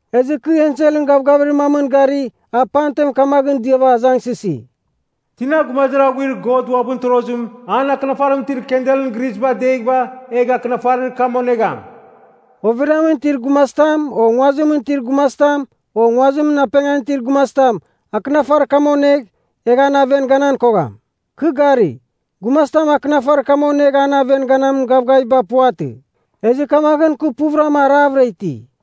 Ezɨ kɨ enselɨn gavgavir mamɨn gari a pamten kamaghɨn diava azangsɨsi, “Tina gumazir aghuir God uabɨn torozim, an akɨnafarimɨn itir kandelɨn grisba adeghɨva, egh akɨnafarir kam onegham?” Overiamɨn itir gumazitam, o nguazimɨn itir gumazitam, o nguazimɨn apengan itir gumazitam, akɨnafarir kam onegh, egh an aven ganan kogham. Kɨ gari, gumazitam akɨnafarir kam onegh an aven ganamin gavgaviba puvatɨ. Ezɨ kamaghɨn kɨ puvɨrama aravɨra iti.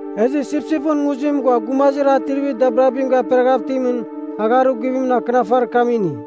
Ezɨ Sipsipɨn Nguzim ghua gumazir atrivir dabirabim gaperaghav itimɨn agharir guvimɨn, akɨnafarir kam ini.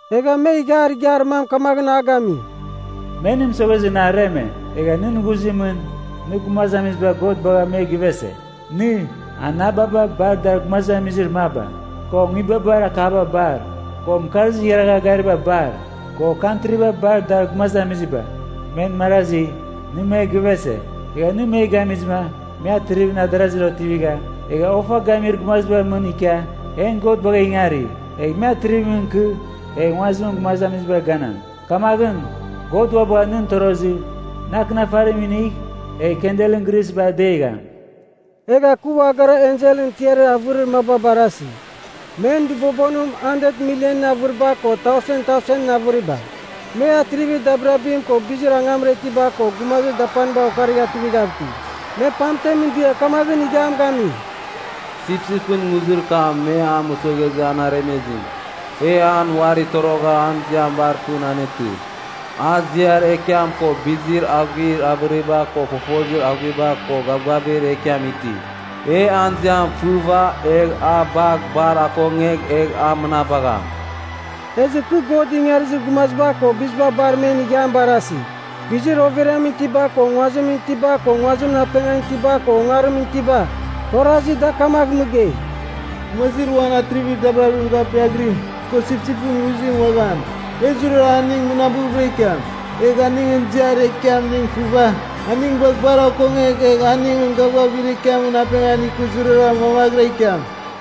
Egha me ighiar igiar mam kamaghɨn a gami, “Me nɨ mɨsoghezɨ nɨ areme, egha nɨn ghuzimɨn nɨ gumazamiziba God bagha me givese. Nɨ, anababa bar dar gumazamizir maba, ko nguibabar akaba bar, ko mɨkarzir igharagha gariba bar, ko kantriba bar dar gumazamiziba, men marazi, nɨ me givese. Egha nɨ me gamizɨma me atrivimɨn adarazir otivigha, egha ofa gamir gumazibar mɨn ikia, en God bagha ingari. Egh me atrivimɨn ikɨ, egh nguazimɨn gumazamizibar ganam. Kamaghɨn, God ua bagha nɨn torozɨ, nɨ akɨnafarim inigh egh kandelɨn grisba adegham.” Egha kɨ ua gara enselɨn tiarir avɨrir maba barasi. Men dɨbobonim handet milienɨn avɨriba ko tausen tausenɨn avɨriba. Me atrivir dabirabim ko bizir angamra itiba ko gumazir dapaniba okarigha tuivighav iti. Me pamten dia kamaghɨn ighiam gami, “Sipsipɨn Nguzir kam me mɨsoghezɨ aremezim, e an uari torogha an ziam bar pɨn anetɨ. A ziar ekiam ko bizir aghuir avɨriba ko fofozir aghuiba ko gavgavir ekiam iti. E an ziam fɨva egh a bagh bar akongegh egh a mɨnabam.” Ezɨ kɨ God ingarizir gumaziba ko biziba bar men ighiam barasi, bizir overiamɨn itiba ko nguazimɨn itiba ko nguazimɨn apengan itiba ko ongarimɨn itiba. Kɨ orazi da kamagh mɨgei, “Gumazir uan atrivir dabirabim gapiaghirim, ko sipsipɨn nguzim uaghan, e zurazurara aning mɨnabɨvɨra ikiam. Egh aningɨn ziar ekiamning fɨva, aning bagh bar akongegh egh aningɨn gavgavir ekiamɨn apengan ikɨ zurara mamaghɨra ikiam.”